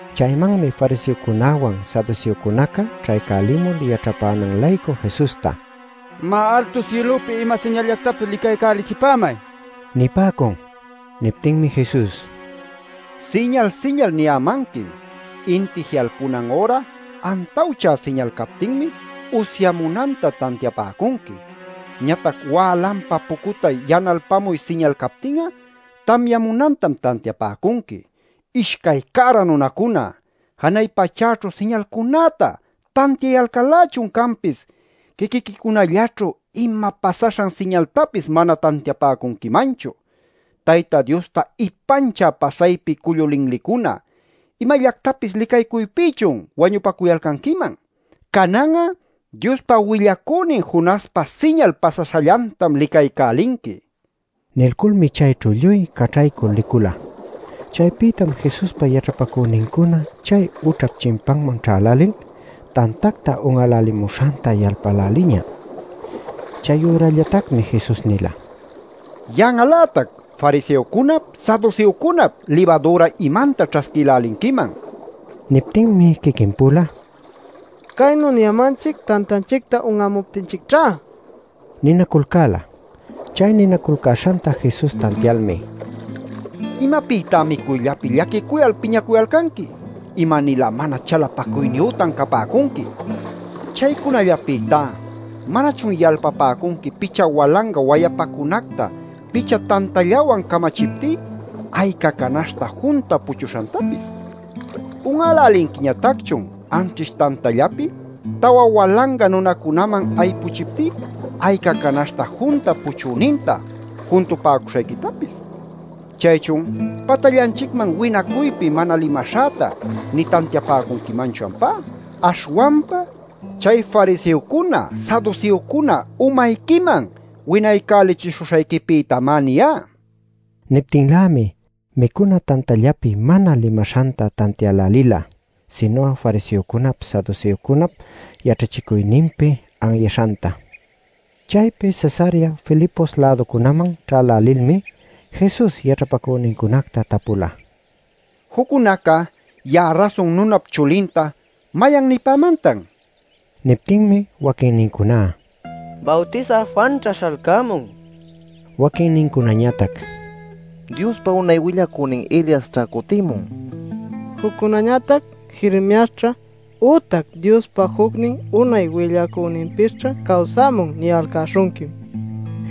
Chaymanmi fariseocunäwan saduseocunaca ćhaycälimul yaćhapänan-laycu Jesusta: “Má, altu sïlupi ima siñalllactapis licaycälichipämay” nipäcun. Niptinmi Jesus: “Siñal siñal niyämanquim. Inti ji'alpunan üra antawchä siñal captinmi usyamunanta tantiapäcunqui. Ñatac wälanpa pucutay yanalpamuy siñal captin'a tamyamunantam tantiapäcunqui. ¡Ishcay cära nunacuna! ¡Janay pachäćhu siñalcunäta tantiayalcal-lächun canpis, quiquiquicunallaćhu ima pasaśhan siñaltapis mana tantiapäcunquimanchu! Tayta Diosta ipanchä pasaypi cullu linlicuna, ¿imallactapis licaycuypïchun wañupacuyalcanquiman? Canan'a Diospa willacünin Jonaspa siñal pasaśhallantam licaycälinqui” nin. Nilculmi chayćhu lluy caćhaycul licula. Chaypïtam Jesuspa yaćhapacünincuna chay ućhap chimpanman ćhälälil tantacta un'älälimuśhanta yalpäläliña. Chayürallatacmi Jesus nila: “¡Yan'al-lätac fariseocunap, saduseocunap libadüra imanta ćhasquïlälinquiman!” nil. Niptinmi quiquin-pula: “Caynu niyämanchic tantanchicta un'amuptinchicćhá” ninaculcäla. Chay ninaculcäśhanta Jesus tantialmi: “¿Imapïtá micuyllapi llaquicuyal piñanacuyalcanqui? ¡Ima-nilä mana chalapacuyniyütan capäcunqui! Chaycunallapïtá ¿manachun yalpapäcunqui picha walanga wayapacunacta picha tantallawan camachiptí, ayca canaśhta junta puchuśhantapis? ¿Un'älälinquiñatacchun anćhish tantallapi tawa walanga nunacunaman aypuchiptí ayca canaśhta junta puchüninta juntupäcuśhayquitapis? ¿Chaychun patallanchicman winaycuypi mana limaśhäta nï tantiapäcunquimanchu ampá? Aśhwanpa chay fariseocuna saduseocuna umayquiman winaycälichishuśhayquipïtamá niyá” nila. Niptinlämi micuna tantallapi mana limaśhanta tantiälälila sinu'a fariseocunap saduseocunap yaćhachicuyninpi anyaśhanta. Chaypi Cesarea Filipos-läducunaman ćhälälilmi Jesus yaćhapacünincunacta tapula: “Juccunaca ya'a Rasun Nunap Chulinta ¿mayan nipämantan?” nil. Niptinmi: “Waquinnincuná: ‘Bawtisä Juanćha śhalcämun’; waquinnincunañatac: ‘Diospa unay willacünin Eliasćha cutïmun’; juccunañatac: ‘Jeremiasćha ütac Diospa jucnin unay willacüninpisćha cawsämun’ niyalcäśhunquim” nipäcula.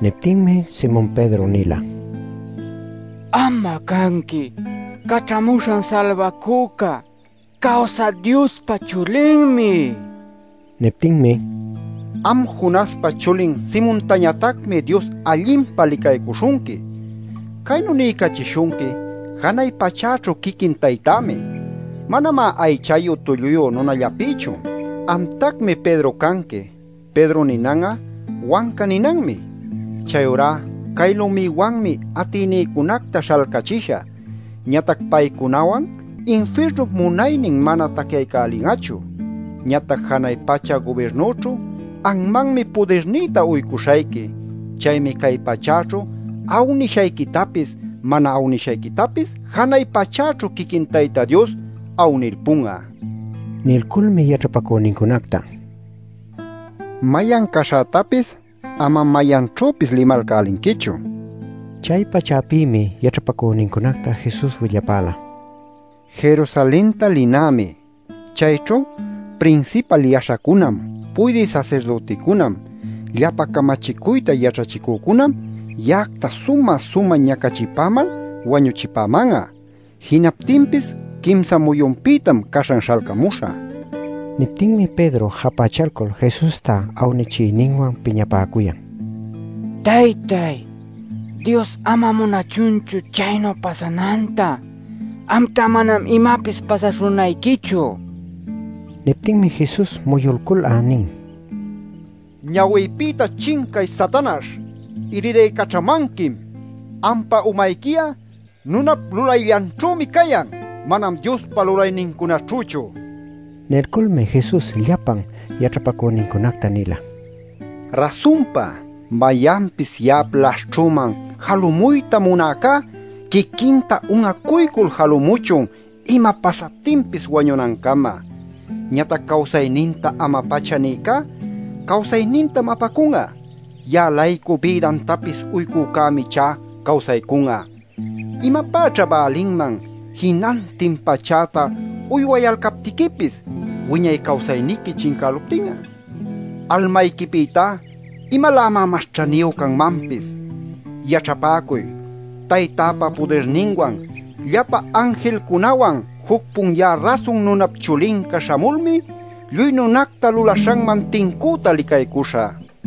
Niptinmi Simon Pedro nila: “Am'a cayanqui Caćhamuśhan Salbacüca, Cawsä Diospa Chulinmi” nil. Niptinmi: “¡Am Jonaspa chulin Simontañatacmi Dios allinpa licaycuśhunqui! Caynu niycachishunqui janay pachäćhu quiquin Taytämi; manamá aychayu tulluyu nunallapïchu. Amtacmi Pedro canqui. (‘Pedro’ ninan'a ‘wanca’ ninanmi.) Chayurá cay lumïwanmi atïnïcunacta śhalcachishä, ñatac paycunawan infirnup munaynin manam tacyaycälin'achu. Ñatac janay pacha gubirnüćhu anmanmi pudirnïta uycuśhayqui. Chaymi cay pachäćhu awnishayquitapis mana awnishayquitapis janay pachäćhu quiquin Tayta Dios awnilpun'a” nin. Nilculmi yaćhapacünincunacta: “Mayan caśhätapis amam mayanćhüpis limalcälinquichu” nila. Chay-pachapïmi yaćhapacünincunacta Jesus willapäla: “Jerusalenta linämi. Chayćhu prinsipal yaśhacunam, puydï sasirdüticunam, llapa camachicuyta yaćhachicücunam ya'acta sumä-sumä ñacachipämal wañuchipäman'a. Jinaptinpis quimsa muyunpïtam caśhan śhalcamuśhä” nil. Niptinmi Pedro japächalcul Jesusta awnichiyninwan piñapäcuyan: “¡Taytay, Dios ama munachunchu chaynu pasananta! ¡Amtá manam imapis pasaśhunayquichu!” nil. Niptinmi Jesus muyulcul'a nin: “¡Ñawïpïta chincay, Satanaśh! ¡Iridaycaćhamanquim! ¡Ampa umayqui'a nunap lulayllanćhümi cayan, manam Diospa lulaynincunaćhüchu!” nil. Nilculmi Jesus llapa yaćhapacünincunacta nila: “Rasunpa mayanpis ya'ap laśhćhüman jalumuyta munäcá quiquinta un'acuycul jalumuchun ima pasaptinpis wañunancama. Ñatac cawsayninta ama-pacha nïcá cawsaynintam apacun'a. Ya'a-laycu bïdantapis uycücämi ichá cawsaycun'a. ¿Imapäćha bälinman jinantin pachäta uywayalcaptiquipis, wiñay cawsayniqui chincäluptin'a? ¡¿Almayquipïtá imalämá mas ćhaniyu canmanpis?! Yaćhapäcuy; Taytäpa pudirninwan llapa anjilnincunawan juc-pun ya'a Rasun Nunap Chulinca śhamulmi lluy nunacta lulaśhanman tincüta licaycuśhä.